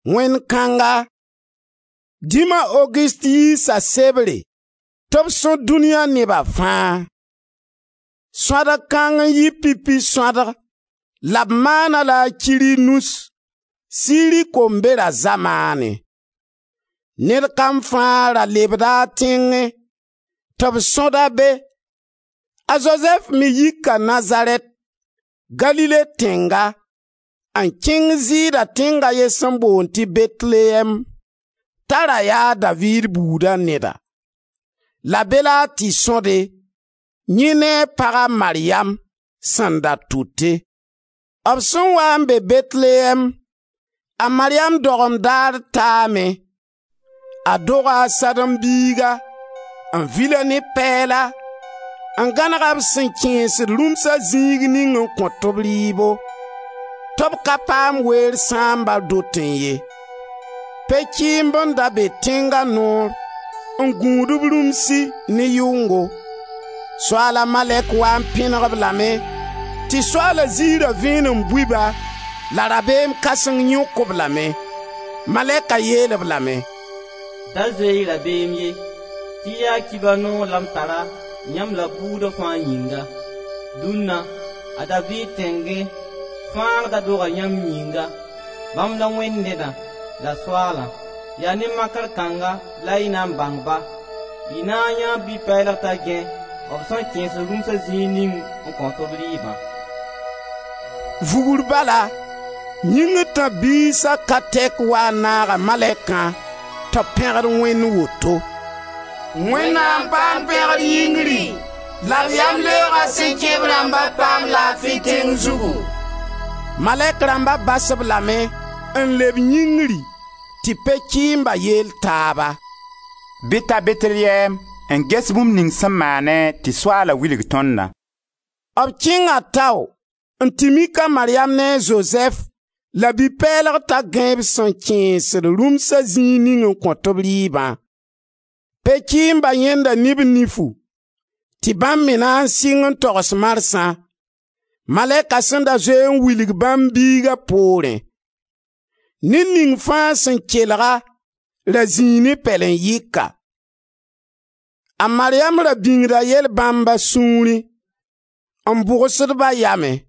Wẽnd kãnga, dĩma, a Ogust, yiisa sebre tɩ b sõd dũniya neba fãa. Sõadg kãng n yɩ pipi sõadg la b maana-a-la a Kirinus, Siri kombera zamaanẽ. Ned kam fãa ra lebda a tẽngẽ tɩ b sõd-a be. A Zozɛf me yika Nazarɛt, Galile tẽnga, n kẽng Zɩɩda tẽng a ye sẽn boond tɩ Bɛtelyɛɛm, t'a ra ya a Daviid buuda neda. La be la a tɩ sõde, yẽ ne a paga, a Maryam, sẽn da tʋte. B sẽn waa n be Bɛtelyɛɛm, a Maryam dogem daar taame. A doga a sãdem-biiga, n vil-a ne pɛɛla, n gãneg-a b sẽn kẽesd rũmsa zĩig ning n kõt b rɩɩbo, tɩ b ka paam weer sãamba dotẽ ye. Pe-kɩɩmb n da be tẽnga noor n gũd b rũmsi ne yʋngo, Soaala malɛk wa n pẽneg-b lame tɩ Soaala zɩɩra vẽenem bui-ba la rabeem kãseng yõk-b lame. Malɛka yeel-b lame: «Da zoe-y rabeem ye tɩ yaa Kibar noog la m tara, yãmb la buuda fãa yĩnga: dũnna, a Daviid tẽngẽ, Fãagda doga yãmb yĩnga; bãmb la Wẽnd Nedã la Soaalã. Yaa ne makr kãnga la y na n bãng-ba: y na n yãee bi-pɛɛlg t'a gãe b sẽn kẽesd rũmsa zĩig ning n kõt-b rɩɩbã.» Vugr bala yĩngr tãb-biisa ka tɛka wa n naaga malɛkã tɩ b pẽgd Wẽnd woto: «Wẽnnaam paam pẽgr yĩngri la b yamleooga sẽn kẽ b rãmba paam laafi tẽng zugu!» Malɛk rãmba bas-b lame n leb yĩngri tɩ pe-kɩɩmba yeel taaba: «Bɩ d ta Bɛtelyɛɛm n ges bũmb ning sẽn maane tɩ Soaala wilg tõndã.» B kẽnga tao n tɩ mik a Maryam ne a Zozɛf la bi-pɛɛlg t'a gãe b sẽn kẽesd rũmsa zĩig ning n kõt-b rɩɩbã. Pe-kɩɩmba yãenda ne b nifu, tɩ bãmb me na n sɩng n togs marsã, malɛka sẽn da zoe n wilg bãmb biiga poorẽ. Ned ning fãa sẽn kelg-a, ra zĩi ne pɛlen-yɩka. A Maryam ra bĩngda yɛl bãmb a sũurẽ, n bʋgsd-ba a yamẽ.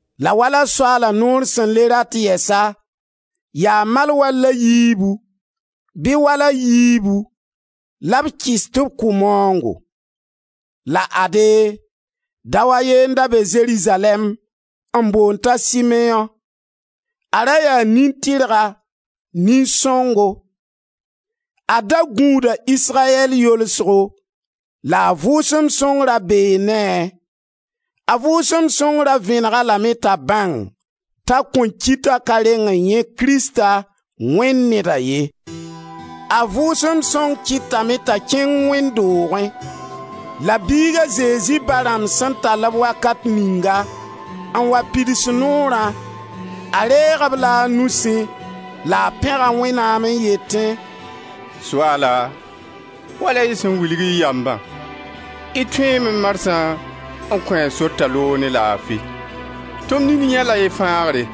la wala Soaala Noor sẽn le rat yɛsa, yaa malwal a yiibu bɩ wal a yiibu la b kɩs tɩ b kʋ maoongo. La ade, dao a ye n da be Zerizalɛɛm n boond t'a Simeõ. A ra yaa nin-tɩrga, nin-sõngo; a da gũuda Israyɛl yolsgo la a Vʋʋsem Sõng ra bee ne-a. A Vʋʋsem Sõng ra vẽneg-a lame t'a bãng t'a kõn ki t'a ka reng n yãe Krista, Wẽnd Neda ye. A Vʋʋsem Sõng kɩtame t'a kẽng wẽnd doogẽ. La biig a Zezi ba rãmb sẽn tall-b wakat ninga n wa pids noorã, a reeg-b la a nusẽ la a pẽga Wẽnnaam n yetẽ: «Soaala, wala y sẽn wilg y yambã, y tõeeme marsã n kõ-a sor t'a loog ne laafi; tɩ m nini yãe-la y fãagre,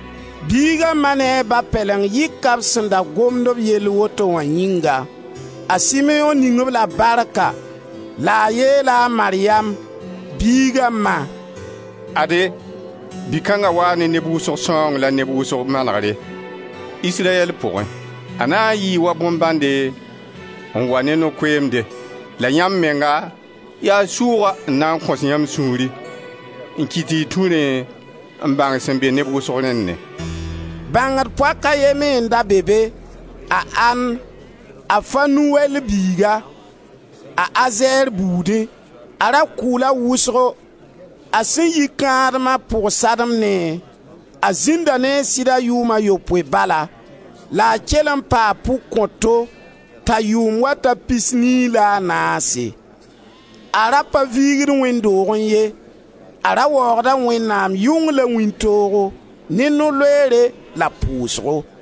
Biiga ma ne a ba pɛleng yika b sẽn da gomd b yell woto wã yĩnga. A Simeõ ning-b la barka la a yeela a Maryam, biiga ma: «Ade, bi-kãnga waa ne neb wʋsgo sãoong la neb wʋsg manegre, Israyɛl pʋgẽ. A na n yɩɩ wa bõn-bãnde n wa ne no-koeemde. La yãmb menga, yaa sʋʋga n na n kõs yãmb sũuri n kɩt tɩ y tũ rẽ n bãng sẽn be neb wʋsg rẽnnẽ.» Bãngd poak a ye me n da be be, a An, a Fanuwɛl biiga, a Azɛr buudẽ; a ra kʋʋla wʋsgo; a sẽn yi kãadem a pʋg-sademnẽ, a zĩnda ne a sɩda yʋʋm a yopoe bala, la a kell n paa pʋg-kõto t'a yʋʋm wa ta pisnii la a naase; a ra pa viigd wẽnd doogẽ ye; a ra waoogda Wẽnnaam yʋng la wĩntoogo, ne no-loeere la pʋʋsgo.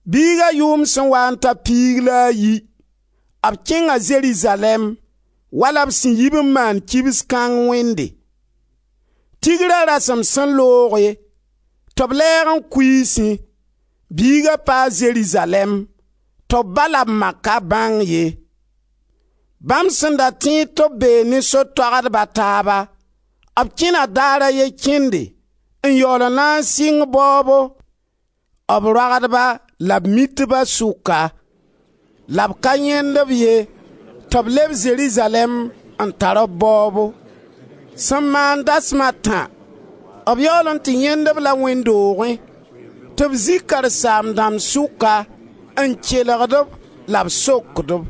Biiga yʋʋm sẽn waa n ta piig la a yi, b kẽnga Zerizalɛɛm, wala b sẽn yib n maand kibs kãng wẽnde. Tigra rasem sẽn looge tɩ b lɛɛg n kuiisẽ, biiga paa Zerizalɛɛm tɩ b ba la b ma ka bãng ye. Bãmb sẽn da tẽed tɩ b bee ne so-toagdb a taaba, b kẽna daar a ye kẽnde n yaool n na n sɩng baoobo, b roagdba la b mitba sʋka la b ka yãend-b ye tɩ b leb Zerizalɛɛm n tar b baoobo. Sẽn maam dasem a tã, b yaool n tɩ yãend-b la wẽnd doogẽ tɩ b zĩ karen-saam-dãmb sʋka n kelgd-b la b sokd-b.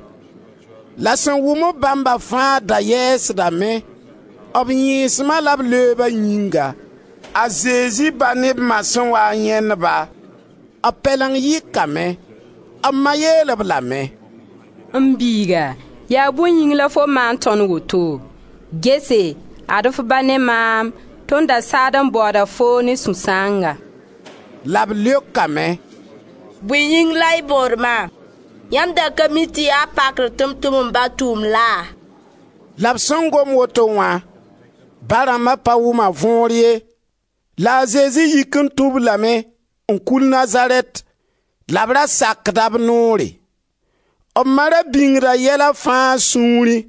La sẽn wʋm-b bãmba fãa da yɛɛsdame, b yẽesma la b leoba yĩnga. B ba ne b ma sẽn waa n yãend-ba, b pɛleng yɩkame. B ma yeel-b lame: «M biiga, yaa bõe yĩng la fo maan tõnd woto? Gese! Ad-f ba ne maam, tõnd da saad n baooda foo ne sũ-sãanga.» La b leokame: «Bõe yĩng la y baood maam? Yãmb da ka mi tɩ yaa pakr tɩ m tʋm m ba tʋʋmd laa?» La b sẽn gom woto wã, ba rãmba pa wʋm a võor ye. La a Zezi yik n tũ-b lame n kul Nazarɛt la b ra sakda b noore. B ma ra bĩngda yɛla fãa a sũurẽ.